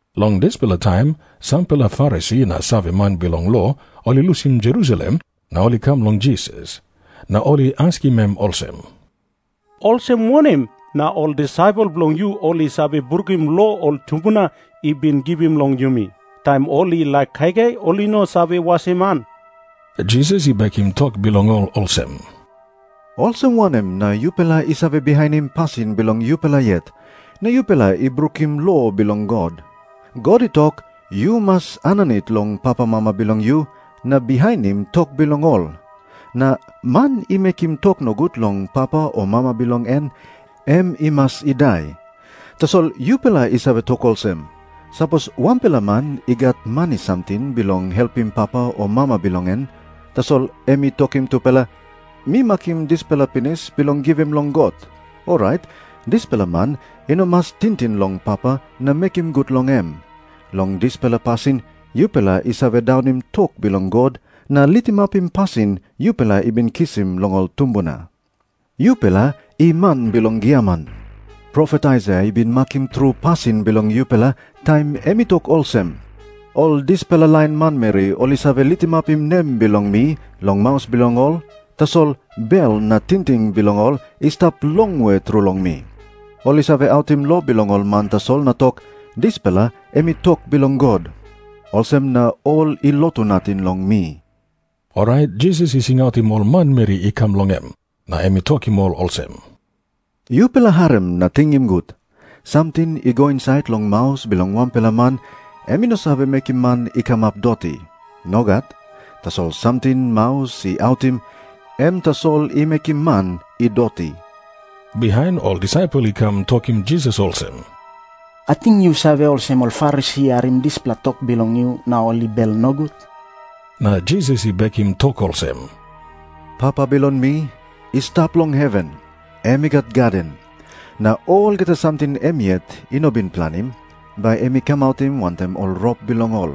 Long dispela taim sampela Farisi na saveman bilong lo ol I lusim Jerusalem na ol i kam long Jisas. Na ol i askim em olsem, "Olsem wanem na ol disaipel bilong yu ol i save brukim lo ol tumbuna I bin givim long yumi? Taim ol i laik kaikai, ol i no save wasim han." Jisas i bekim tok bilong ol olsem, "Olsem wanem na yupela i save bihainim pasin bilong yupela yet, na yupela i brukim lo bilong God? God i tok, 'Yu mas aninit long pamama bilong yu na bihainim tok bilong ol,' na 'Man i mekim tok nogut long papa o mama bilong en, em i mas i dai.' Tasol yupela i save tok olsem, 'Sapos wanpela man i gat mani samting bilong helpim papa o mama bilong en, tasol em i tokim tupela, "Mi makim dispela pinis bilong givim long God," orait dispela man i no mas tingting long papa na mekim gut long em.' Long dispela pasin yupela i save daunim tok bilong God na litimapim pasin yupela i bin kisim long ol tumbuna. "Yupela i man bilong giaman. Profet Aisaia i bin makim tru pasin bilong yupela taim em i tok olsem, 'Ol dispela lain manmeri ol i save litimapim nem bilong mi long maus bilong ol, tasol bel na tingting bilong ol i stap longwe tru long mi. Ol i save autim lo bilong ol man tasol na tok, "Dispela em i tok bilong God." Olsem na ol i lotu nating long mi.'" Orait Jisas i singautim ol manmeri i kam long em, na em i tokim ol olsem, "Yupela harim na tingim gut. Samting i go insait long maus bilong wanpela man, em i no save mekim man i kamap doti. Nogat. Tasol samting maus i autim, em tasol i mekim man i doti." Bihain ol disaipel i kam tokim Jisas olsem, "Ating yu save olsem ol Farisi i harim dispela tok bilong yu na ol i bel nogut?" Na Jisas i bekim tok olsem, "Papa bilong mi i stap long heven, em i gat gaden. Na olgeta samting em yet i no bin planim, bai em i kamautim wantaim ol rop bilong ol.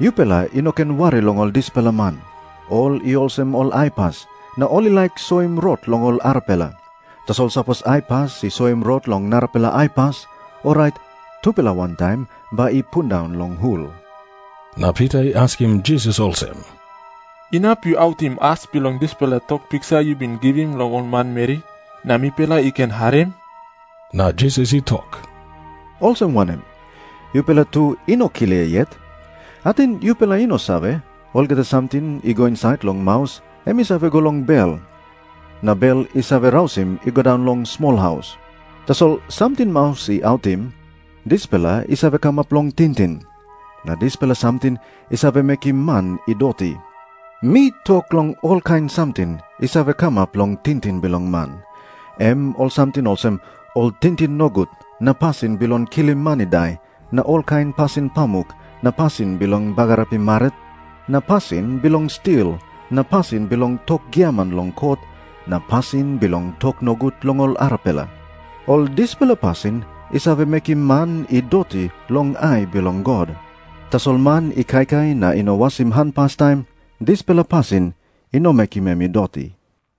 Yupela i no ken wari long ol dispela man. Ol i olsem ol aipas, na ol i laik soim rot long ol arapela. Tasol sapos aipas i soim rot long narapela aipas, orait tupela wantaim bai i pundaun long hul." Na Pita i askim Jisas olsem, "Inap yu autim as bilong dispela tok piksa yu bin givim long ol manmeri, na mipela i ken harim?" Na Jisas i tok, "Olsem wanem? Yupela tu i no klia yet? Ating yupela i no save, olgeta samting i go insait long maus, em i save go long bel, na bel i save rausim i go daun long smolhaus? Tasol samting maus i autim, dispela i save kamap long tingting. Na dispela samting i save mekim man i doti. Mi tok long olkain samting i save kamap long tingting bilong man, em ol samting olsem, ol tingting nogut na pasin bilong kilim man i dai na olkain pasin pamuk na pasin bilong bagarapim marit na pasin bilong stil na pasin bilong tok giaman long kot na pasin bilong tok nogut long ol arapela. Ol dispela pasin i save mekim man i doti long ai bilong God. Tasol man i kaikai na i no wasim han pastaim, dispela pasin i no mekim em i doti."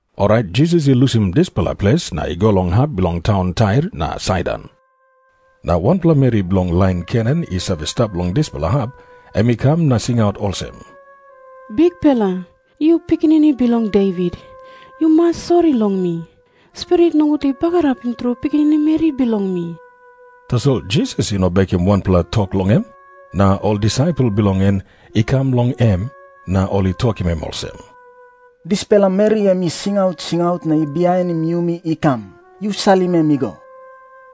Orait Jisas i lusim dispela ples na i go long hap bilong taun Tair na Saidon. Na wanpela meri bilong lain Kenan i save stap long dispela hap, em i kam na i singaut olsem, "Bikpela, yu Pikinini Bilong Devit, yu mas sori long mi. Spirit nogut i bagarapim tru pikinini meri bilong mi." Tasol Jisas i no bekim wanpela tok long em. Na ol disaipel bilong en i kam long em na ol i tokim em olsem, "Dispela meri em i singaut singaut na i bihainim yumi i kam. Yu salim em i go."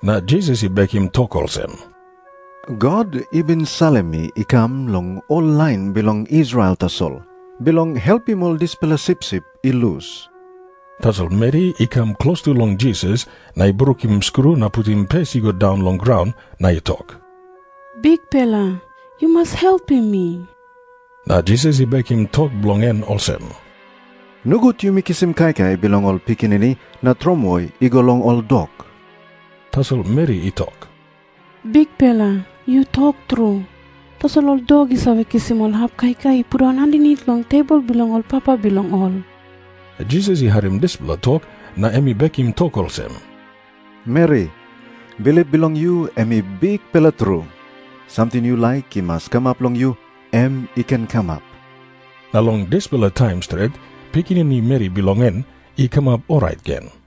Na Jisas i bekim tok olsem, "God i bin salim mi i kam long ol lain bilong Israel tasol, bilong helpim ol dispela sipsip i lus." Tasol meri i kam klostu long Jisas na i brukim skru na putim pes i go daun long graun, na i tok, "Bikpela, yu mas helpim mi." Na Jisas i bekim tok bilong en olsem, "Nogut yumi kisim kaikai bilong ol pikinini na tromoi i go long ol dok." Tasol meri i tok, "Bikpela, yu tok tru. Tasol ol dok i save kisim ol hap kaikai i pundaun aninit long tebol bilong ol papa bilong ol." Jisas i harim dispela tok na em i bekim tok olsem, "Meri, bilip bilong yu em I bikpela tru. Samting yu laik i mas kamap long yu, em i ken kamap." Na long dispela taim stret, pikinini meri bilong en i kamap orait gen.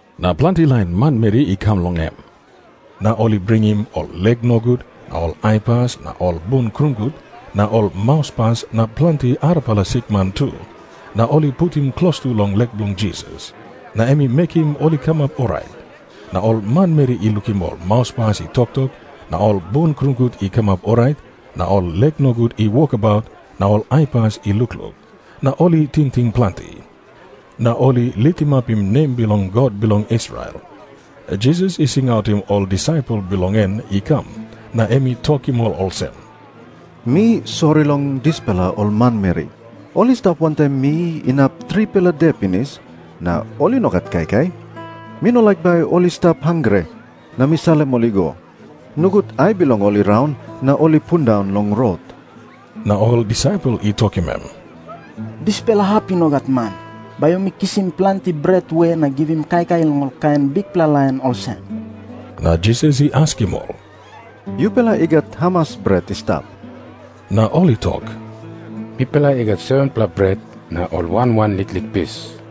Na planti lain manmeri i kam long em. Na ol i bringim ol lek nogut na ol aipas na ol bun krungut na ol mauspas na planti arapela sikman tu, na ol i putim klostu long lek bilong Jisas. Na em i mekim ol i kamap orait. Na ol manmeri i lukim ol mauspas i toktok na ol bun krungut i kamap orait na ol lek nogut i wokabaut na ol aipas i lukluk, na ol i tingting planti. Na ol i litimapim nem bilong God bilong Israel. Jisas i singautim ol disaipel bilong en i kam, na em i tokim ol olsem, "Mi sori long dispela ol manmeri. Ol i stap wantaim mi inap tripela de pinis na ol i no gat kaikai. Mi no laik bai ol i stap hangre na mi salim ol i go. Nogut ai bilong ol i raun na ol i pundaun long rot." Na ol disaipel i tokim em, "Dispela hap i no gat man. Bai yumi kisim planti bret we na givim kaikai long kain bikpela lain olsem?" Na Jisas i askim ol, "Yupela i gat hamas bret i stap?" Na ol i tok, "Mipela i gat 7-pela bret na ol wan wan liklik pis."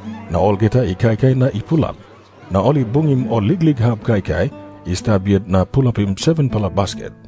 Na olgeta i kaikai na i pulap. Na ol i bungim ol liklik hap kaikai i stap yet na pulapim 7-pela basket.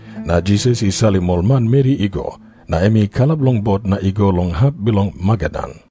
Na Jisas i salim ol manmeri i go, na em i kalap long bot na i go long hap bilong Magadan.